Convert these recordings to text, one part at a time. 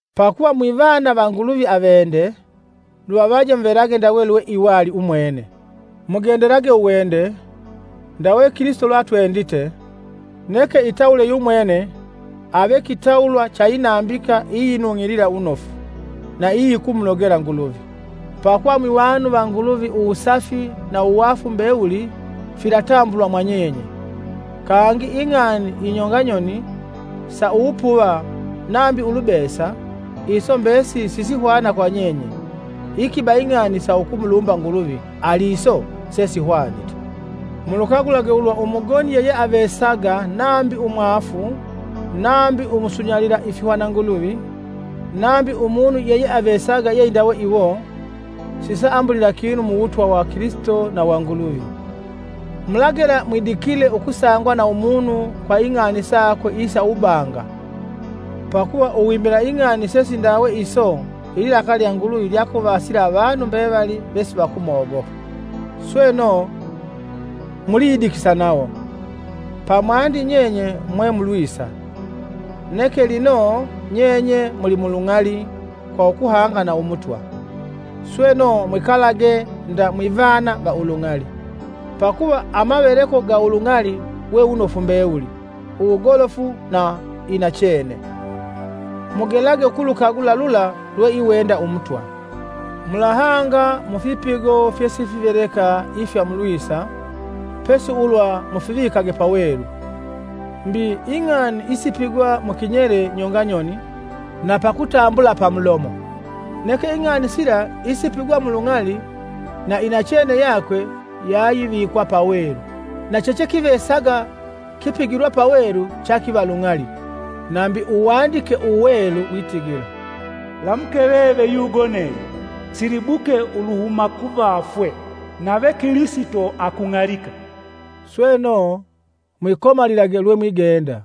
Pakuva mwivana va Nguluvi avende, luvavaje muvelage ndawe lweiwali umwene. Mugendelage uwende, ndawe Kilisito lweatwendite, neke itawule yumwene ave kitawulwa cha inambika iyinung'ilila wunofu na iyikumunogela Nguluvi. Pakuva mwivanu va Nguluvi uwusafi, na uwaafu mbewuli filatambulwa mwa nyenye. Kangi ing'ani inyonga nyoni, sa uwupuva nambi ulubesa, iso mbesili sisihwana kwa nyenye; ikiba ing'ani sa ukumulumba Nguluvi, ali iso sesihwanite. Mulukagulage ulwa umugoni yeyeavesaga nambi umwaafu, (nambi umusunyalila ifihwananguluvi), nambi umunu yeyeavesaga yeindawe iwo, sisaambulila kinu Muwutwa wa Kilisito na wa Nguluvi. Mulagela mwidikile ukusangwa na umunu kwa ing'ani sakwe isa uwubanga pakuva uwimila ing'ani sesindawe iso ililakali lya Nguluvi lyakuvasila avanu mbevali vesivakumogopa. Sweno, muliyidikisa nawo. Pamwandi nyenye mwe mulwisa, neke lino nyenye mulimulung'ali kwa ukuhanga na Umutwa. Sweno mwikalage nda mwivana va ulung'ali: pakuva amaveleko ga ulung'ali we wunofu mbewuli, uwugolofu na inachene. Mugelage ukulukagula lula lweiwenda Umutwa. Mulahanga mu fipigo fyesifiveleka ifya mulwisa, pesi ulwa mufivikage pawelu. Mbi ing'ani isipigwa mu kinyele nyonganyoni na pakutambula pamulomo. Neke ing'ani sila isipigwa mulung'ali, na inachene yakwe yayivikwa pawelu, na chechekivesaga kipigilwa pawelu chakiva lung'ali. Nambi Uwandike Uwelu witigila: “Lamuke veve yugonelye, silibuke uluhuma kuvafwe, nave Kilisito akung'alika.” Sweno, mwikomalilage lwe mwigenda: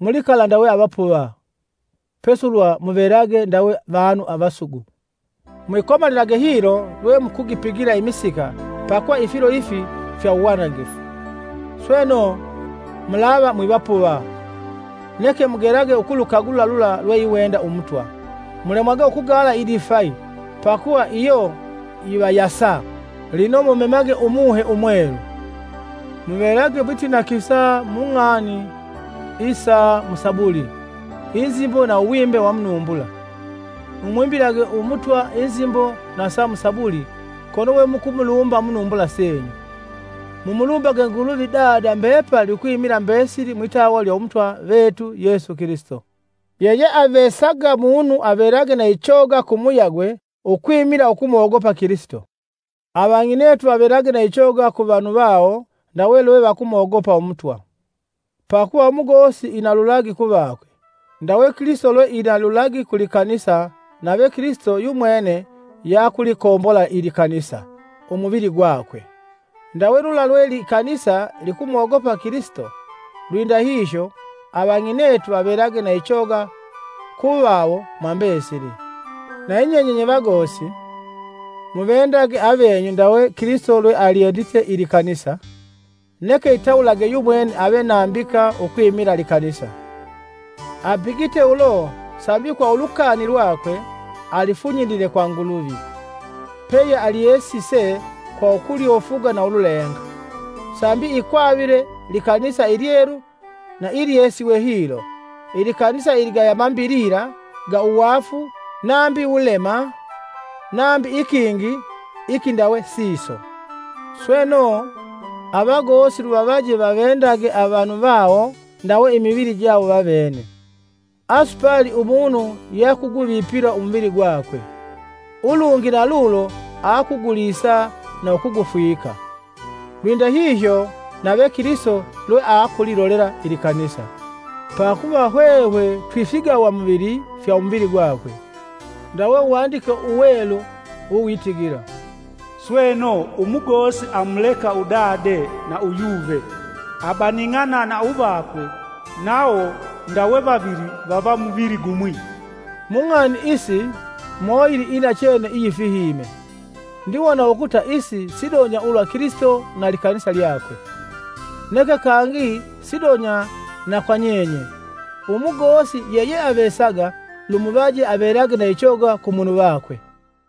mulikala ndawe avapuva, pesi ulwa muvelage ndawe vanu avasugu. Mwikomalilage hilo lwe mukugipigila imisika pakuva ifilo ifi fya uwanangifu. Sweno, mulava mwivapuva, neke mugelage ukulukagula lula lweiwenda Umutwa. Mulemwage ukugaala idifai pakuva iyo yivayusa, lino mumemage Umuhe Umwelu. Muvelage mwitinakisa mung'ani isa mu Sabuli, nzimbo na uwimbe wa munumbula, mumwimbilage Umutwa inzimbo na sa musabuli kono we mukumulumba munumbula senyu. Mumulumbage Nguluvi Dada mbepali ukwimila mbesili mwitawa lya Umutwa vetu Yesu Kilisito. Yeyeavesaga munu avelage na ichoga kumuyagwe ukwimila ukumogopa Kilisito. Avang'inetu vavelage na ichoga ku vanu vawo ndawe lwe vakumogopa Umutwa. Pakuva umugosi ina lulagi ku vakwe, ndawe Kilisito lwe ina lulagi ku likanisa nave Kilisito yumwene yeakulikombola ilikanisa, umuvili gwakwe. Ndawe lula lwe likanisa likumogopa Kilisito, lwindahihyo, avang'inetu vavelage na ichoga ku vawo mwambesili. Nayinyenye nye vagosi, muvendage avenyu ndawe Kilisito lwe alyendite ilikanisa, neke itawulage yumwene ave nambika ukwimila likanisa. Apigite ulo sambi kwa ulukani lwakwe, alifunyilile kwa Nguluvi, peyealyesise kwa ukulyofuga na ululenga, sambi ikwavile likanisa ilyelu na ilyesiwe hilo, ilikanisa iligaya mambilila ga uwaafu nambi wulema nambi ikingi ikindawe siso. Sweno, avagosi luvavaje vavendage avanu vawo ndawe imivili jawo vavene. ( Asupali umunu yakuguvipila umuvili gwakwe; ulungi nalulo aakugulisa na ukugufwika. Lwindahihyo nave Kilisito lweakulilolela ilikanisa, pakuva hwehwe twifigawamuvili fya umuvili gwakwe.) Ndawe Uwandike Uwelu uwitigila, “Sweno, umugosi amuleka udade na uyuve, abaning'ana na uvakwe nawo ndawe vavili vava muvili gumwi.” Mung'ani isi moyili inachene iyifihime, ndiwona ukuta isi sidonya ulwa Kilisito na likanisa lyakwe. Neke kangi sidonya na kwa nyenye: umugosi yeyeavesaga lumuvaje avelage na ichoga ku munu vakwe.